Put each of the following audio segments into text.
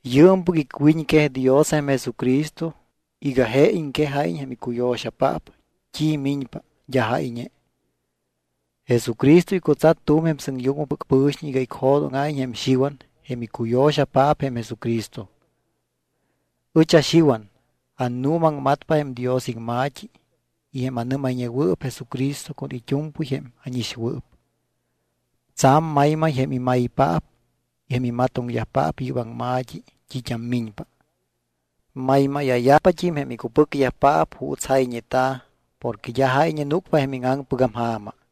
Yɨɨmpɨc icwiñquej Dios jém Jesucristo iga je iŋquejáyiñ jém icuyo̱xayajpaap t́i miñpa d́a jáyñe. Jesucristo icutsat tu̱m jém sɨŋyucmɨpɨc pɨ̱xiñ iga icjo̱dóŋa̱iñ jém Xiwan jém icuyo̱xapaap jém Jesucristo. Ɨch aXiwan, annuumaŋmatpa jém Dios iŋma̱t́i y jém anɨ́mayñewɨɨp Jesucristo con it́u̱mpɨy jém ánixwɨɨp. Tsa̱m maymay jém imaypaap y jém imatoŋyajpaap yɨ́p aŋma̱t́i t́it́am miñpa. Maymáya̱yajpat́im jém icupɨcyajpaap juuts jayñeta̱ porque d́a jáyñe núcpa jém íŋaŋpɨgam ja̱ma.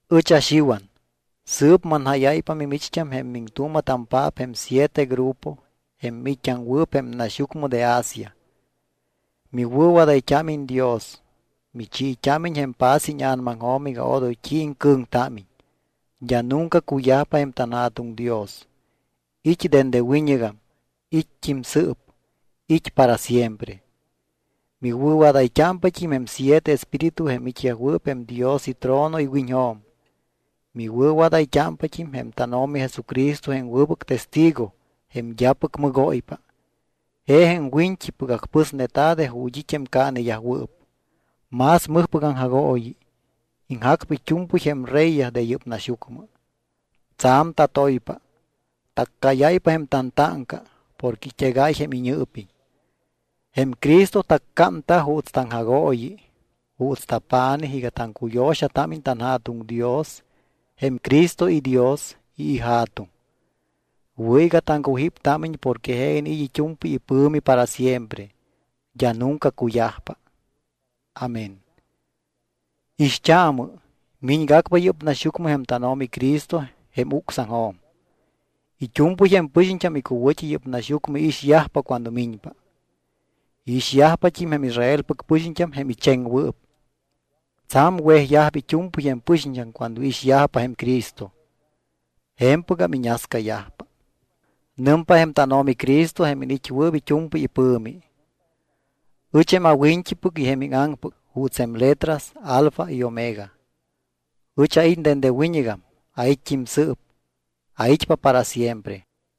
Ɨch aXiwan, sɨɨp manjáyáypa mimicht́am jém miŋtuuma̱tampaap jém siete grupo jém miit́t́aŋwɨɨp jém naxyucmɨ de Asia. Miwɨ̱wadayt́ámiñ Dios, michiit́ámiñ jém paz íña̱namaŋjo̱m iga odoy t́i iŋcɨ̱ŋtámiñ. D́a nunca cuyajpa jém tanJa̱tuŋ Dios, it́ dende wiñɨgam, it́t́im sɨɨp, it́ para siempre. Miwɨ̱wadayt́ámpat́im jém siete espíritu jém it́yajwɨɨp jém Dios itrono iwiñjo̱m. Miwɨ̱wadayt́ámpat́im jém tánO̱mi Jesucristo jém wɨbɨc testigo jém d́apɨc mɨgóypa. Je jém wiñt́ipɨc acpɨsneta̱ de ju̱t́ it́ jém caaneyajwɨɨp. Más mɨjpɨc aŋjagooyi, iŋjacpa it́u̱mpɨy jém reyyaj de yɨ́p naxyucmɨ. Tsa̱m tatoypa. Taccáyáypa jém tantáŋca porque it́egáy jém iñɨɨpiñ. Jém Cristo taccámta juuts taŋjagooyi, juuts tapa̱nij iga taŋcuyo̱xatámiñ tanJa̱tuŋ Dios jém Cristo iDios y iJa̱tuŋ. Wɨ̱ iga taŋcujíptámiñ porque je iniit́ it́u̱mpɨy ipɨ̱mi para siempre, d́a nunca cuyajpa. Amén. Ixt́aamɨ. Miñgacpa yɨ́p naxyucmɨ jém tánO̱mi Cristo jém ucsaŋjo̱m. It́u̱mpɨy jém pɨxiñt́am icuwɨ̱t́i yɨ́p naxyucmɨ iixyajpa cuando miñpa. Iixyajpat́im jém Israelpɨc pɨxiñt́am jém icheŋwɨɨp. Tsa̱m wejyajpa it́u̱mpɨy jém pɨxiñt́am cuando iixyajpa jém Cristo. Je̱mpɨgam iñascayajpa. Nɨmpa jém tánO̱mi Cristo jém iniit́wɨɨp it́u̱mpɨy ipɨ̱mi: “Ɨch jém awiñt́ipɨc y jém íŋaŋpɨc juuts jém letras alfa y omega.” Ɨch ait́ dende wiñɨgam, ait́t́im sɨɨp, ait́pa para siempre.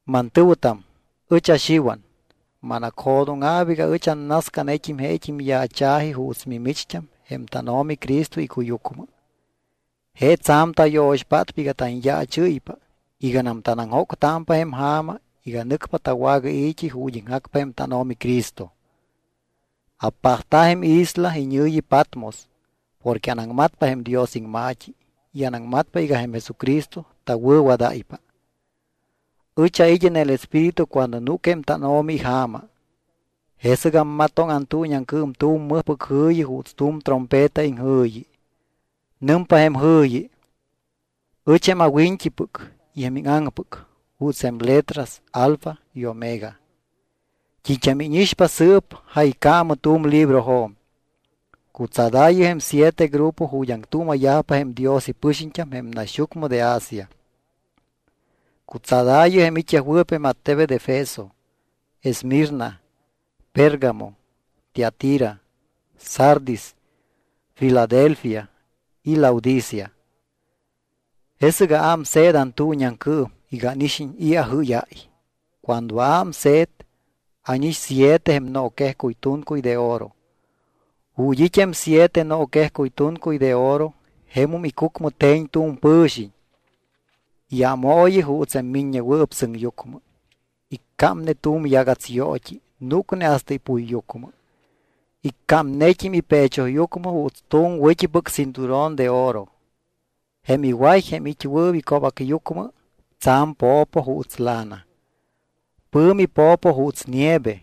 Mantɨ̱wɨtam, ɨch aXiwan, manacjo̱dóŋa̱p iga ɨch annascanet́im jém yaacha̱ji juuts mimicht́am jém tánO̱mi Cristo icuyucmɨ. Je tsa̱m tayo̱xpátpa iga tanyaachɨ́ypa iganam tanaŋjóctámpa jém ja̱ma iga nɨcpa tawagai̱t́i ju̱t́ iŋjacpa jém tánO̱mi Cristo. Apajta̱ jém isla iñɨ̱yi Patmos porque anaŋmatpa jém Dios iŋma̱t́i y anaŋmatpa iga jém Jesucristo tawɨ̱wadáypa. Ɨch ait́ en el Espíritu cuando núc jém tánO̱mi ija̱ma. Jesɨc ammatoŋ antuuñiaŋcɨɨm tu̱m mɨjpɨc jɨ̱yi juuts tu̱m trompeta iŋjɨ̱yi. Nɨmpa jém jɨ̱yi: —Ɨch jém awiñt́ipɨc y jém íŋaŋpɨc juuts jém letras alfa y omega. T́it́am íñixpa sɨɨp jaycaamɨ tu̱m librojo̱m. Cutsadaayɨ jém siete grupo ju̱t́ aŋtuuma̱yajpa jém Dios ipɨxiñt́am jém naxyucmɨ de Asia. Cutsadaayɨ jém it́yajwɨɨp jém attebet Efeso, Esmirna, Pérgamo, Tiatira, Sardis, Filadelfia y Laodicea. Jesɨc aámse̱t antuuñiaŋcɨɨm iga ánixiñ i̱ ajɨ́yáy. Cuando aámse̱t, ánix siete jém nooquejcuy tuncuy de oro. Ju̱t́ it́ jém siete nooquejcuy tuncuy de oro, jemum icucmɨ te̱ñ tu̱m pɨ̱xiñ, iámooyi juuts jém Miññewɨɨp Sɨŋyucmɨ. Iccámne tu̱m yagats yoot́i núcne hasta ipuyyucmɨ. Iccámnet́im ipechoyucmɨ juuts tu̱m wɨ̱t́ipɨc cinturón de oro. Jém iway jém it́wɨɨp ico̱bacyucmɨ tsa̱m po̱po juuts lana. Pɨ̱mi po̱po juuts nieve.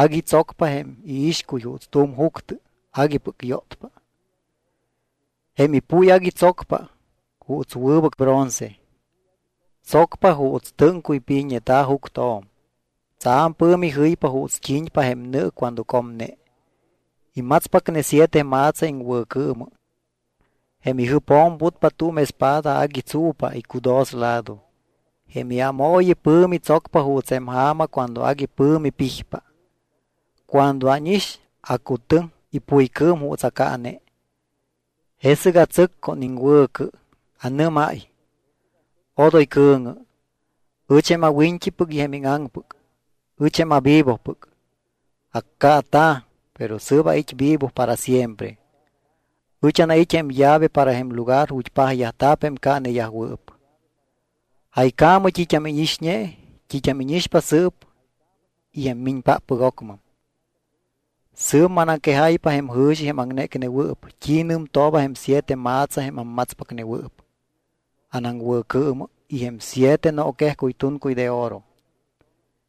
Agui tsocpa jém iixcuy juuts tu̱m juctɨ aguipɨc yótpa. Jém ipuy agui tsocpa juuts wɨbɨc bronce. Tsocpa juuts tɨ́ŋcuy pijneta̱ juctjo̱m. Tsa̱m pɨ̱mi jɨypa juuts t́i̱ñpa jém nɨ cuando comne. Imatspacne siete ma̱tsa iŋwɨ̱cɨɨmɨ. Jém ijɨpjo̱m putpa tu̱m espada agui tsu̱pa icudoslado. Jém iámooyi pɨ̱mi tsocpa juuts jém ja̱ma cuando agui pɨ̱mi pijpa. Cuando ánix, acutɨŋ ipuycɨɨm juuts acaane. Jesɨc atsɨc con iŋwɨ̱cɨ. Anɨ́máy: —Odoy cɨ̱ŋɨ. Ɨch jém awiñt́ipɨc y jém íŋaŋpɨc. Ɨch jém avivopɨc. Accaata̱, pero sɨɨp ait́ vivo para siempre. Ɨch anait́ jém llave para jém lugar ju̱t́ pajyajta̱p jém caaneyajwɨɨp. Jaycaamɨ t́it́am íñixñe, t́it́am íñixpa sɨɨp y jém miñpáppɨc ocmɨm. Sɨɨp manaŋquejáypa jém jɨ̱xi jém aŋnécnewɨɨp, t́i nɨmtooba jém siete ma̱tsa jém ammatspacnewɨɨp anaŋwɨ̱cɨɨmɨ y jém siete nooquejcuy tuncuy de oro.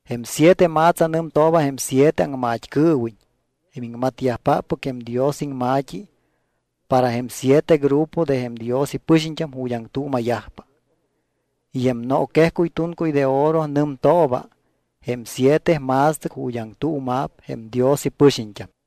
Jém siete ma̱tsa nɨmtooba jém siete aŋmat́cɨɨwiñ jém iŋmatyajpáppɨc jém Dios iŋma̱t́i para jém siete grupo de jém Dios ipɨxiñt́am ju̱t́ aŋtuuma̱yajpa. Y jém nooquejcuy tuncuy de oro nɨmtooba jém siete ma̱stɨc ju̱t́ aŋtuuma̱p jém Dios ipɨxiñt́am.